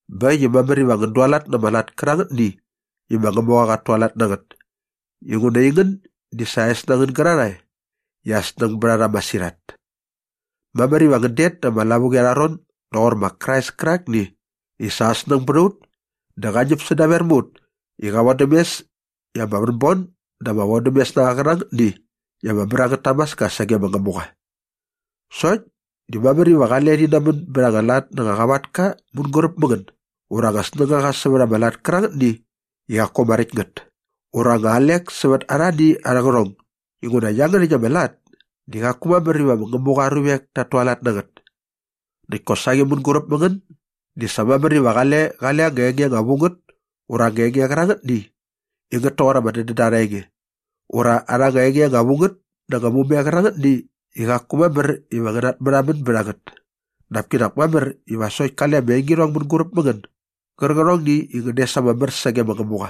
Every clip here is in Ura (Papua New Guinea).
Bä äkt i mamär iva ngän dualat na ama lat kärangätni i ma Ngämuqa qat tualat na ngät inguna aingän di sa aa es na ngän gärarhae i aa snäng bät a rha masirhat. Mamär iva ngän det da ama lavuqi arha ron doqor ma Krais kärakni i sa aa snäng bät a ut dä qa ñäp sädaver mä ut i qa vodäm mes i ama vänbon dä ama vodämes na qa qärangätni i ama mär angät tamaska sage ma Ngämuqa. Sokt di mamär iva qale rhi namän bät anga lat na ama qavatka mänguräp mä ngän ura anga snängaqa sävät ama lat kärangätni i qaku ama räkt ngät ura anga alek sävät arhani arhä qärhong inguna iangärhäkt ama lat di qaku mamär iva ma Ngämuqa aa ruvek tat tualat na ngät. Näkt kosaqi mänguräp mä ngän di sa mamär iva qale qale anga enge anga vu ngät ura ama enge qärangätni i ngät toqor ama dädända arha enge ura arha enge anga vu ngät na anga mume qärangätni i qaku mamär iva ngän natmärhamän bät a ngät dap kinak mamär iva sokt kale ama engirhong mänguräp mä ngän gärqärhongni i ngän des ama mär sage ma Ngämuqa.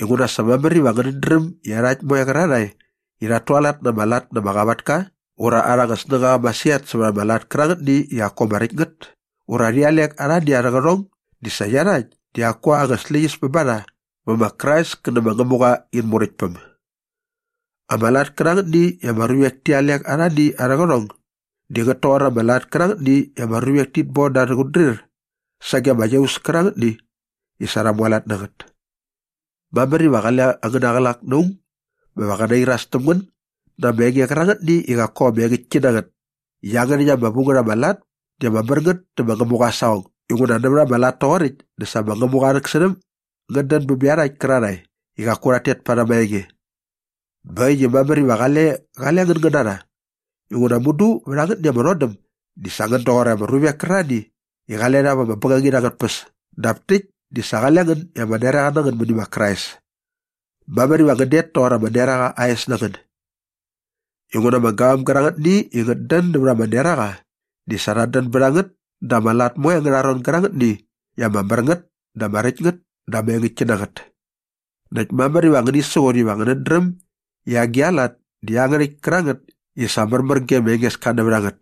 Inguna sa mamär iva ngänät dräm i iarhakt moe qärarhae i rhat tualat na ama lat na ama qavatka ura arha anga snängaqa masirhat sävät ama lat kärangätni i qaku ama räkt ngät ura rhi alek arhani arhä qärhong di sa iarhakt di qaku anga släqyäs bä ba rha vä ma Krais kä nä ma Ngämuqa in Muräktpäm. Ama lat kärangätni i ama ruvek ti alek arhani arhä qärhong di ngät toqor ama lat kärangätni i ama ruvek tit bon da arhä qutdrir sage ama iaus kärangätni i sa rha mualat na ngät. Mamär iva qale angäna qlak na aung bä qä nairas täm ngän na ama enge qärangätni i qaku ama engäktki na ngät i iangärhäkt ama lat ama vu ngät di ama mär ngät dä ma Ngämuqa aa saqong inguna nävät ama lat toqoräkt dä sa ma Ngämuqa aa rhäksärhäm ngät dän bä bä iarhakt kärarhae i qaku rhat tet parhäm aa enge. Bä äkt i mamär iva qale qale ngän ngän na rha inguna mudu vät angätni ama rhodäm di sa qale ngän doqor ama ruvek kärarhani i qale rha vä bängangit angät tpäs dap täkt di sa qale ngän i ama neraqa na ngän mäni ma Krais. Mamär iva ngän det toqor ama neraqa aa es na ngän. Inguna ama gavam gärangätni i ngät dän nävät ama neraqa di sa rhat dän bät a ngät da ama lat moe angärha ron gärangätni i ama mär ngät dä ama räkt ngät dä ama engäktki na ngät. Näkt mamär iva ngäni siqut iva ngänät dräm i agi a lat di iangärhäkt kärangät i sa märmär ge ma Engeska nävät a ngät.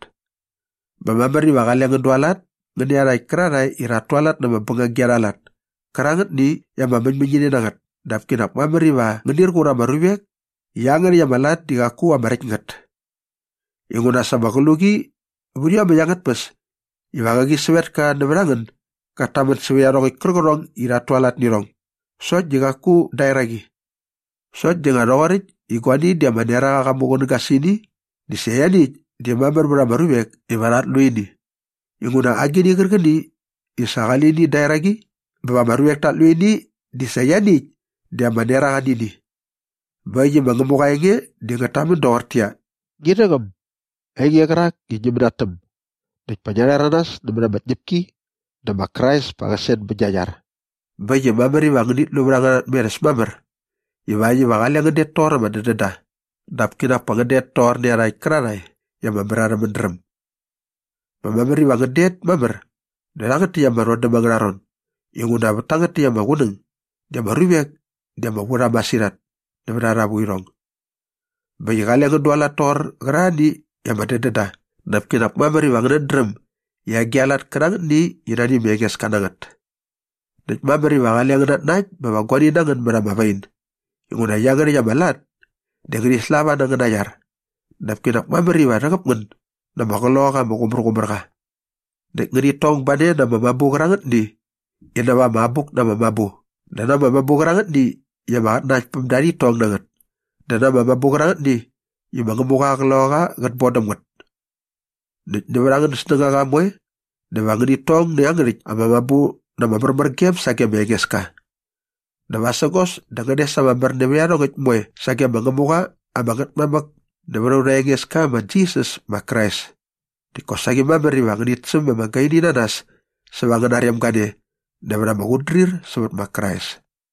Bä mamär iva qale ngän dualat ngän nä iarhakt kärarhae i rhat tualat na ama bängagi arha lat kärangätni i ama mäñmäñini na ngät dap kinak mamär iva ngänir qur ama ruvek i iangärhäkt ama lat di qaku ama räkt ngät. Inguna sa ama qluqi vät iomäkt angät tpäs iva qäqi sävetka nävät a ngän gat tamän sävät iarhongäkt kärqärhong i rhat tualat nä irhong sokt di qaku da eraqi. Sokt di nga rhoqoräkt i guani di ama neraqa qa muqunäga sä ini dä sa ianiäkt di mamär vät ama ruvek iva rhat lu ini inguna agini qärqäni i sa qali lini da eraqi bä ama ruvek tat lu ini di sa ianiäkt di ama neraqa nä ini. Bä äkt i ma Ngämuqa aa enge di ngät tamän doqortäqyia, “Ngi rhäqäm, ainge qärak i ngi mänatäm näkt pa ngia rhäranas nämät ama tñäpki dä ma Krais pa qä sen bät gia iar.” Bä äkt i mamär iva ngänit lu vät angäna tmerhäs mamär ivakt iva qale ngän det toqor ama dädända dap kinak pa ngän det toqor iarhakt kärarhae i ama mär arhä mädräm. Bä mamär iva ngän det mamär dä rhangät täkt ama rhodäm angärha ron inguna vät tangät täkt ama qunäng di ama ruvek di ama vu rha masirhat nävät arha vuirhong. Bä äkt i qale ngän dualat toqor qärarhani i ama dädän da dap kinak mamär iva ngänät dräm i agi a lat kärangätni i nani ma Engeska na ngät. Näkt mamär iva qale ngän natnakt bä va guani na ngän mät ama wain inguna iangärhäkt ama lat di ngärhi slava na angäna iar dap kinak mamär iva rhäqäp ngän na ama Qloqaqa ama Qumärqumärqa. Näkt ngänit tong ba ne na ama mabu qärangätni i näva ama Abuk na ama Mabu dä na ama mabu qärangätni i ama qatnanaktpämda rhit tong na ngät dä na ama mabu qärangätni i ma Ngämuqa aa Qloqaqa qät bon ngän däm ngät. Näkt nävät angän snängaqa moe dä va ngänit tong nä iangärhäkt ama mabu na ama märmärgem sage ma Engeska. Dä vasägos dä va ngän des ama mär nävät iarhongäkt moe sage ma Ngämuqa ama Ngätmamäk nävät aurha Engeska ma Jisas ma Krais. Näkt kosaqi mamär iva ngänit säm ama gaini na nas säva angäna rem gane nävät ama qutdrir sävät ma Krais.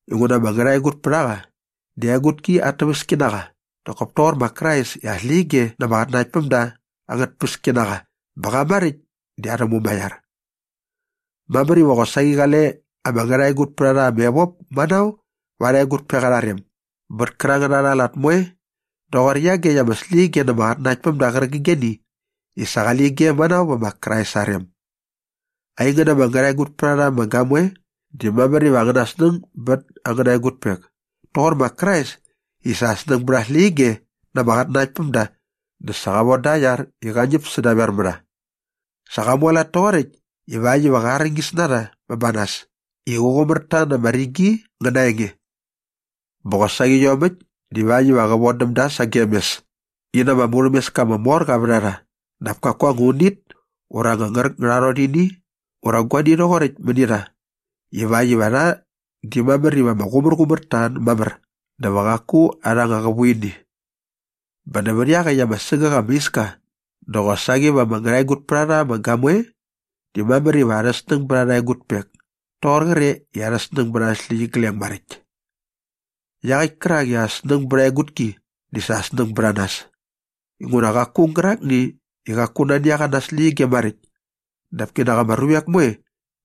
Inguna ama ngärhaegutpärhaqa di aa egutki at täväski na qa nak kop toqor ma Krais i aa släqyige na ama qatnanaktpämda angät tpäski na qa bä qa maräkt di arhä Mumaiar. Mamär iva qosaqi qale ama ngärhaegutpärharha ama evop manao va arha egutpek arha rem bät kärangät arha lat moe rhoqor iagekt ama släqyige na ama qatnanaktpämda qärqigeni i sa qale ige manao vä ma Krais aa rem. Aingän ama ngärhaegutpärharha ama gamoe di mamär iva angäna snäng bät angäna egutpek toqor ma Krais i sa aa snäng bät aa släqyige na ama qatnanaktpämda dä sa qa voda aa iar i qa ñäp sädaver mä rha. Sa qa mualat toqoräkt ivakt iva qä arñis na rha bä ba nas i qä qumär ta na ama rigi ngä na aa enge. Bä qosaqi iomäkt divakt iva qä vodäm da sagem mes i na ama murhämeska ama mor qa vät a rha dap kaku anga unit ura anga ngärätngärorhini ura guani rhoqoräkt mäni rha ivakt iva rha di mamär iva ama qumärqumär ta mamär dä va qaku arha anga qävuini. Bä nävät iaqäkt ama sägäk ama iska dä qosaqi va ama ngärhaegutpärharha ama gamoe di mamär iva arha snäng bät arha egutpek toqor qre i arha snäng bät arhä släqyigleng maräkt. Iaqäkt kärak i aa snäng bät aa egutki di sa aa snäng bät a nas. Inguna qaku aung gärakni i qaku nani a qa na aa släqyige maräkt dap kinak ama ruvek moe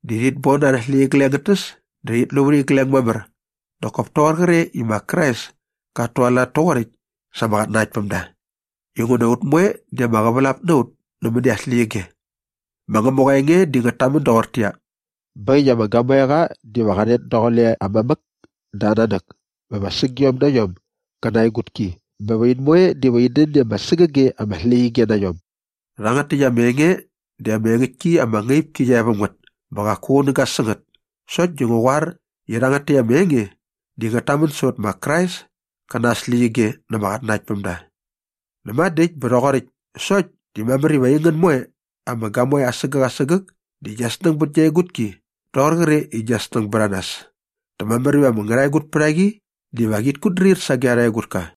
di rhit bon arhä släqyigleng ngät täs dä rhit lu vät igleng mamär nak kop toqor qre i ma Krais kat tualat toqoräkt sa ama qatnanaktpämda inguna ut moe di ama qävälap na ut nämäni aa släqyige. Ma Ngämuqa aa enge di ngät tamän doqortäqyia, “Bä äkt i ama gamoeqa diva qa rhet daqule aa mamäk dä aa nanäk bä va sägiom na iom gä na aa egutki bä va in moe diva in dän i ama sägäge ama släqyige na iom.” Rhangät täkt ama enge di ama engäktki ama ngaip ki qia e väm ngät bä qaku qunäga sä ngät sokt di ngu qoar i rhangät täkt ama enge di ngät tamän sävät ma Krais kä na aa släqyige na ama qatnanaktpämda. Näma dä äkt bä rhoqoräkt sokt di mamär iva aingän moe ama gamoe asägäk asägäk di gia snäng bät gia egutki rhoqor qre i gia snäng bät a nas dä mamär iva ama ngärhaegutpärhaqi diva qit kutdrir sage arha egutka.